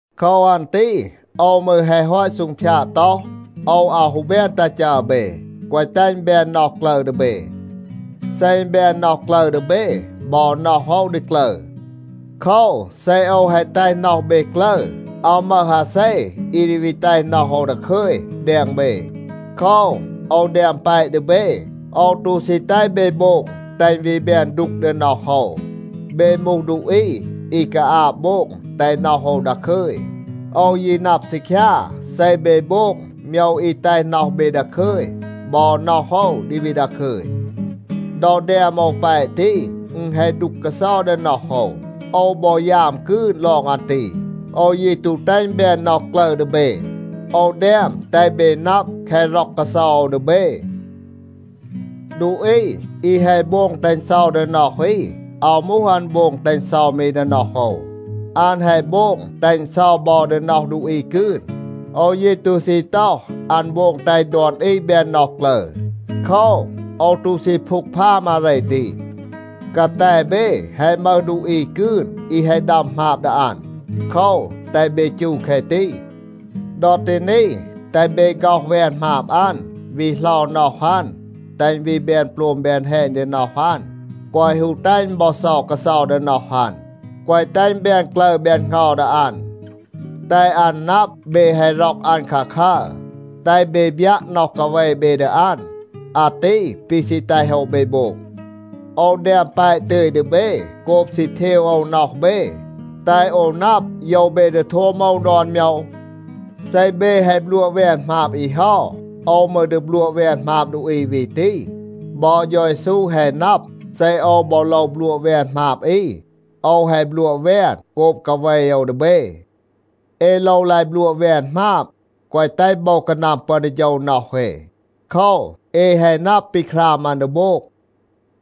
โคว อัน ตี โอว มืร แฮะ ฮอต ซูงพยาด ต็อห, โอว อาว ฮู แบน ตัห จัร เบ, แกวะ แตห อึณ แบน น็อห กลึร ดี เบ. เซ อึณ แบน น็อห กลึร ดี เบ, บอ น็อห โอว ดี กลึร. โคว, เซ โอว แฮะ แตห น็อห เบ กลึร, อาว มึห อาเซ อี ดี วี แตห น็อห โอว ดาคึย แดง เบ. โคว, โอว แดม แปะ ดี เบ. โอว ตู ซี แตห เบ โบง แตห อึณ วี แบน ดูก ดี น็อห โอว. เบ มูห ดูอี อี กาอาบ โบง แตห น็อห โอว ดาคึย. โอว ยี นับ ซีคยา, เซ เบ โบง โมยว อี แตห น็อห เบ ดาคึย บอ น็อห โอว ดี วี ดาคึย. ดอ แดม โอว แปะ ตี, อึณ แฮะ ดูก กาเซา ดี น็อห โอว. โอว บอ ยาม กืน ลอง อัน ตี. โอว ยี ตู แตห อึณ แบน น็อห กลึร ดี เบ. โอว แดม แตห เบ นับ แคะ ร็อก กาเซา โอว ดี เบ. ดูอี อี แฮะ โบง แตห อึณ เซา ดี น็อห อี, อาว มูห อัน โบง แตห อึณ เซา มี ดี น็อห โอว. อัน แฮะ โบง แตห อึณ เซา บอ ดี น็อห ดูอี กืน. โอว ยี ตู ซี ต็อห, อัน โบง แตห ดอน อี แบน น็อห กลึร. โคว, โอว ตู ซี พูกพาม อาเร ตี. กาแต เบ แฮะ มึห ดูอี กืน อี แฮะ ดัม หมาบ ดี อัน. โคว, แตห เบ จู แคะ ตี. ดอ ตี นี, แตห เบ ฆ็อห แวน หมาบ อัน, วี เหลา น็อห อัน, แตห อึณ วี แบน โปลม แบน แฮณ ดี น็อห อัน, แกวะ ฮู แตห อึณ บอ เซา กาเซา ดี น็อห อัน, แกวะ แตห อึณ แบน กลึร แบน เหงา ดี อัน. แตห อัน นับ เบ แฮะ ร็อก อัน คาคัร. แตห เบ บยัะ น็อห กาเว เบ ดี อัน. อาตี ปี ซี แตห โอว เบ โบง. โอว แดม แปะ ตึย ดี เบ โกบ ซี เทว โอว น็อห เบ, แตห โอว นับ, โยว เบ ดี โทม โอว ดอน โมยว. เซ เบ แฮะ บลัวะ แวน หมาบ อี เฮา, โอว มืร ดี บลัวะ แวน หมาบ ดูอี วี ตี. บอ เฌา เยซู แฮะ นับ, เซ โอว บอ โลว บลัวะ แวน หมาบ อี, โอว แฮะ บลัวะ แวน โกบ กาเว โอว ดี เบ. เอ โลว ลาย บลัวะ แวน หมาบ, แกวะ แตห โบว กานัม ปึอน ดี โฌว น็อห เอ. โคว, เอ แฮะ นับ ปี คราม อัน ดี โบง.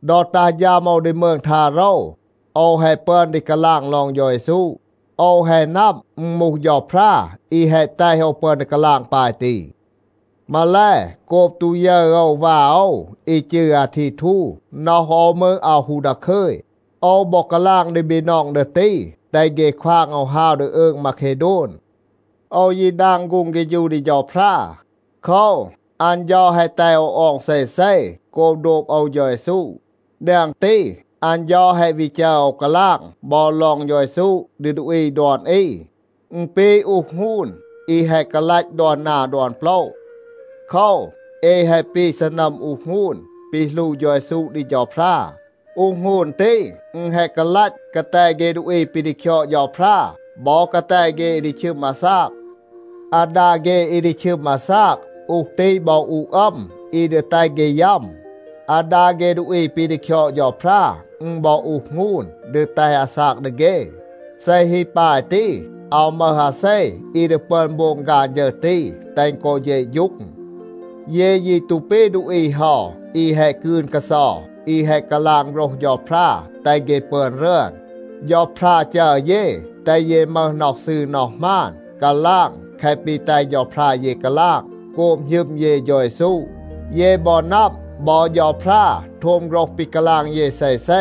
ดอ ตัห ฌัม โอว ดี มืง ทาโรว, โอว แฮะ ปึอน ดี กาลาง ลอง เฌา เยซู. โอว แฮะ นับ, อึณ มูห เฌาพรา อี แฮะ แตห โอว ปึอน ดี กาลาง ปาย ตี. มาแล, โกบ ตู ยึร โอว วา โอว อี จืร อาทีทู, น็อห โอว มืร อาว ฮู ดาคึย. โอว บอ กาลาง ดี บีนอง ดี ตี, แตห เฆ ควาง โอว ฮาว ดี อืง มาเคโดน. โอว ยี ดาง ฆูง เฆฌู ดี เฌาพรา. โคว, อัน เฌา แฮะ แตห โอว ออง เซเซ โกบ โดบ โอว เฌา เยซู. แดง ตี, อัน เฌา แฮะ วี จัร โอว กาลาง บอ ลอง เฌา เยซู ดี ดูอี ดอน อี. อึณ ปี อูห หงูน อี แฮะ กาลัต ดอน นา ดอน โปละ. โคว, เอ แฮะ ปี ซีนัม อูห หงูน ปี หลู เฌา เยซู ดี เฌาพรา. อูห หงูน ตี, อึณ แฮะ กาลัต กาแต เฆ ดูอี ปี ดี คยอด เฌาพรา, บอ กาแต เฆ อี ดี ชึม อาซาก. อาดา เฆ อี ดี ชึม อาซาก, อูห ตี บอ อูห อัม อี ดี แตห เฆ ยัม. อาดา เฆ ดูอี ปี ดี คยอด เฌาพรา, อึณ บอ อูห หงูน ดี แตห อาซาก ดี เฆ. เซ ฮี ปาย ตี, อาว มึห อาเซ อี ดี ปึอน โบง ฆาน ฌึร ตี, แตห อึณ กอ เฌะฌูง. เย ยี ตู ปี ดูอี เฮา อี แฮะ กืน กาเซา, อี แฮะ กาลาง โฆรห เฌาพรา แตห เฆ ปึอน รึอน. เฌาพรา จัร เย, แตห เย มึห น็อห ซืร น็อห หมาน, กาลาง แคะ ปี แตห เฌาพรา เย กาลาง โกบ หณึม เย เฌา เยซู. เย บอ นับ, บอ เฌาพรา โทม โฆรห ปี กาลาง เย เซเซ.